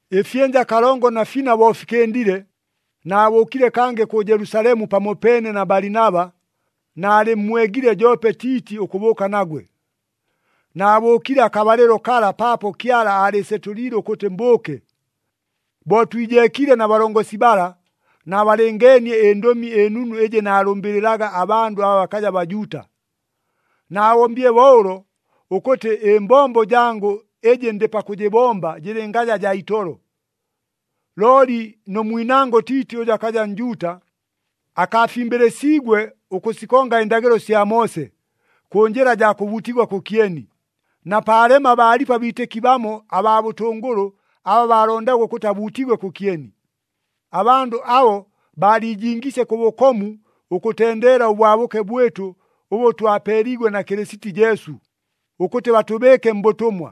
Ɨfyɨnja kalongo na fina bo fikɨndile, naabʉʉkile kangɨ kʉ Jelusalemu pamopeene na Balinaba, naalɨmmwegile joope Tiiti ʉkʉbʉʉka nagwe. Naabʉʉkile akabalɨlo kala paapo Kyala aalɨɨsetʉliile ʉkʉtɨ mbʉʉke. Bo twijeekiile na balongosi bala, naabalɨngeenie ɨNdʉmi ɨNunu ɨjɨ naabalʉmbɨlɨlaga abandʉ aba bakaja Bajuuta. Naabombile bo ʉlo ʉkʉtɨ ɨmbombo jangʉ ɨjɨ ndɨ pakʉjɨbomba jɨlɨngaja jaa itolo. Looli nʉ mwinangʉ Tiiti ʉjʉ akaja Njuuta, akaafimbɨlɨsiigwe ʉkʉsikonga ɨndagɨlo sya Moose, kʉ njɨla jaa kʉbuutigwa kʉkyeni, na paalema baalipo abiitɨki bamo abaa bʉtʉngʉlʉ aba baalondaga ʉkʉtɨ abuutigwe kʉkyeni. Abandʉ abo baaliijingiisye kʉ bʉkomu ʉkʉtendeela ʉbwabʉke bwɨtʉ ʉbʉ twapeeliigwe na Kɨlɨsiti Jesu, ʉkʉtɨ batʉbɨɨke mbʉtʉmwa.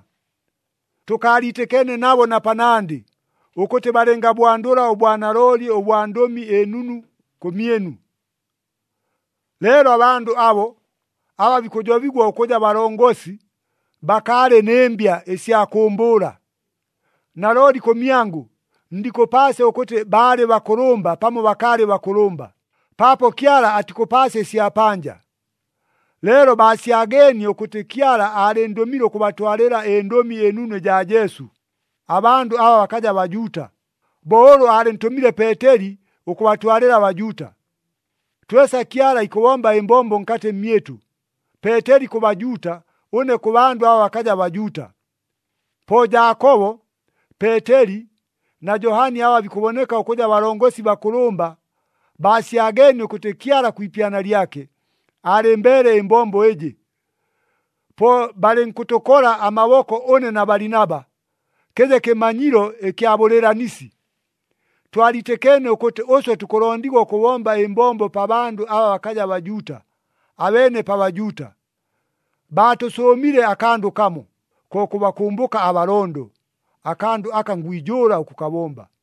Tʉkaaliitɨkeene nabo na panandɨ, ʉkʉtɨ balɨngabwandʉla ʉbwanalooli ʉbwa Ndʉmi ɨNunu, kʉmyɨnu. Leelo abandʉ abo, aba bikʉjobigwa ʉkʉja balongosi, bakaalɨ nɨ mbya ɨsya kʉʉmbʉʉla. Nalooli kʉmyangʉ ndikʉpaasya ʉkʉtɨ baalɨ bakʉlʉmba pamo bakaalɨ bakʉlʉmba, paapo Kyala atikʉpaasya ɨsya panja. Leelo baasyageenie ʉkʉtɨ Kyala aalɨndʉmile ʉkʉbatwalɨla ɨNdʉmi ɨNunu ɨjaa Jesu, abandʉ aba bakaja Bajuuta, bo ʉlʉ aalɨntʉmile Peeteli ʉkʉbatwalɨla aBajuuta. Twesa Kyala ikʉbomba ɨmbombo nkatɨ mmyɨtʉ, Peeteli kʉ Bajuuta, ʉne kʉ bandʉ aba bakaja Bajuuta. Po Jaakobo, Peeteli na Johani aba bikʉboneka ʉkʉja balongosi bakʉlʉmba, baasyageenie ʉkʉtɨ Kyala kwi ipyana lyake, aalɨmbeele ɨmbombo ɨjɨ. Po balɨnkʉtʉkola amaboko ʉne na Balinaba, kɨje kɨmanyilo ɨkya bʉlɨɨlanisi. Twaliitɨkeene ʉkʉtɨ ʉswe tukʉlondigwa ʉkʉbomba ɨmbombo pa bandʉ aba bakaja Bajuuta, abeene pa Bajuuta. Baatʉsʉʉmile akandʉ kamo, ko kʉbakʉmbʉka abalondo, akandʉ aka ngwijʉʉla ʉkʉkabomba.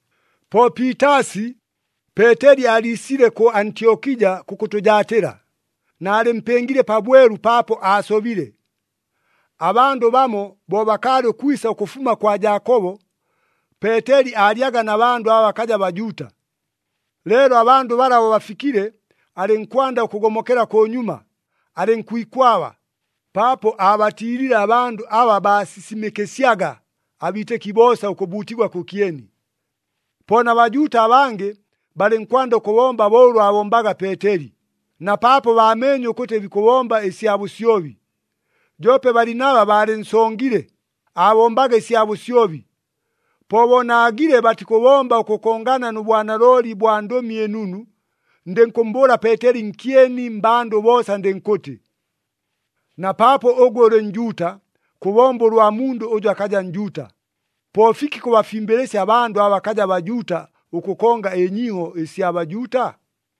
Po piitaasi, Peeteli aaliisile kʉ Antyokija kʉkʉtʉjaatɨla, naalɨmpɨngile pabwelu paapo aasobile. Abandʉ bamo bo bakaalɨ ʉkwisa ʉkʉfuma kwa Jaakobo, Peeteli aalyaga na bandʉ aba bakaja Bajuuta. Leelo abandʉ bala bo bafikile, alɨnkwanda ʉkʉgomokela kʉnyuma, alɨnkwikwaba, paapo aabatiilile abandʉ aba baasisimɨkɨsyaga abiitɨki boosa ʉkʉbuutigwa kʉkyeni. Po na Bajuuta abangɨ balɨnkwanda ʉkʉbomba bo ʉlʉ aabombaga Peeteli, na paapo baameenye ʉkʉtɨ bikʉbomba ɨsya bʉsyobi. Joope Balinaba baalɨnsongile, aabombaga ɨsya bʉsyobi. Po bo naagile batikʉbomba ʉkʉkongana nʉ bwanalooli bwa Ndʉmi ɨNunu, ndɨnkʉmmbʉʉla Peeteli nkyeni mmbandʉ boosa ndɨnkʉtɨ, “Na paapo ʉgwe ʉlɨ Njuuta, kʉbomba ʉlwa mundʉ ʉjʉ akaja Njuuta! Po fiki kʉbafimbɨlɨsya abandʉ aba bakaja Bajuuta ʉkʉkonga ɨnyiiho ɨsya Bajuuta?”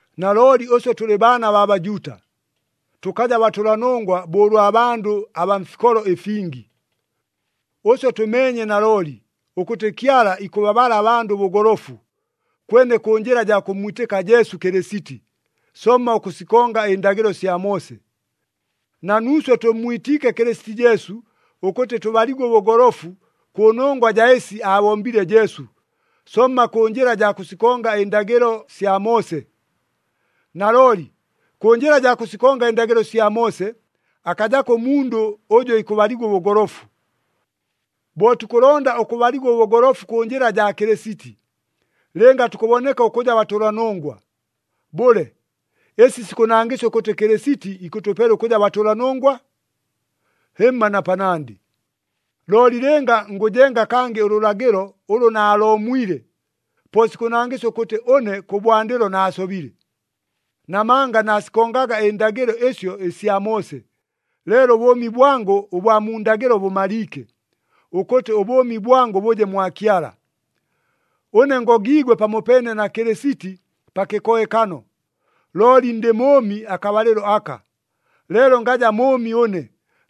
Nalooli ʉswe tʉlɨ baana baa Bajuuta, tʉkaja batʉlanongwa bo ʉlwa bandʉ abaa mfikolo ɨfingi. Ʉswe tʉmeenye nalooli, ʉkʉtɨ Kyala ikʉbabala abandʉ ʉbʉgolofu, kwene kʉ njɨla jaa kʉmmwitɨka Jesu Kɨlɨsiti, somma ʉkʉsikonga ɨndagɨlo sya Moose. Na nuuswe tʉmmwitiike Kɨlɨsiti Jesu ʉkʉtɨ tʉbaligwe ʉbʉgolofu kʉnongwa jaa ɨsi aabombile Jesu, somma kʉ njɨla jaa kʉsikonga ɨndagɨlo sya Moose. Nalooli, kʉ njɨla jaa kʉsikonga ɨndagɨlo sya Moose, akajako ʉmundʉ ʉjʉ ikʉbaligwa ʉbʉgolofu. Bo tukʉlonda ʉkʉbaligwa ʉbʉgolofu kʉ njɨla jaa Kɨlɨsiti, lɨnga tukʉboneka ʉkʉja batʉlanongwa, bʉle, ɨsi sikʉnangɨsya ʉkʉtɨ Kɨlɨsiti ikʉtʉpela ʉkʉja batʉlanongwa? Hɨmma na panandɨ! Looli lɨnga ngʉjenga kangɨ ʉlʉlagɨlo ʉlʉ naaloomwile, po sikʉnangɨsya ʉkʉtɨ ʉne kʉbwandɨlo naasobile. Namanga naasikongaga ɨndagɨlo ɨsyo ɨsya Moose, leelo ʉbʉʉmi bwangʉ ʉbwa mu ndagɨlo bʉmaliike, ʉkʉtɨ ʉbʉʉmi bwangʉ bʉje mwa Kyala. Ʉne ngogiigwe pamopeene na Kɨlɨsiti pa kɨkohekano, looli ndɨ mʉʉmi akabalɨlo aka, leelo ngaja mʉʉmi ʉne,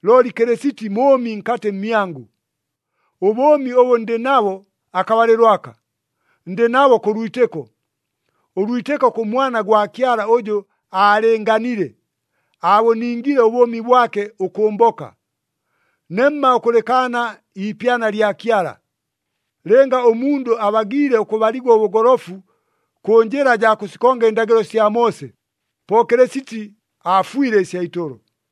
looli Kɨlɨsiti mʉʉmi nkatɨ mmyangʉ. Ʉbʉʉmi ʉbʉ ndɨ nabo akabalɨlo aka, ndɨ nabo kʉ lwitɨko, ʉlwitɨko kʉ Mwana gwa Kyala ʉjʉ aalɨɨnganile, aabʉningile ʉbʉʉmi bwake ʉkʉmboka. Nemma ʉkʉlɨkaana iipyana lya Kyala. Lɨnga ʉmundʉ abagiile ʉkʉbaligwa ʉbʉgolofu kʉ njɨla jaa kʉsikonga ɨndagɨlo sya Moose, po Kɨlɨsiti aafwile ɨsya itolo!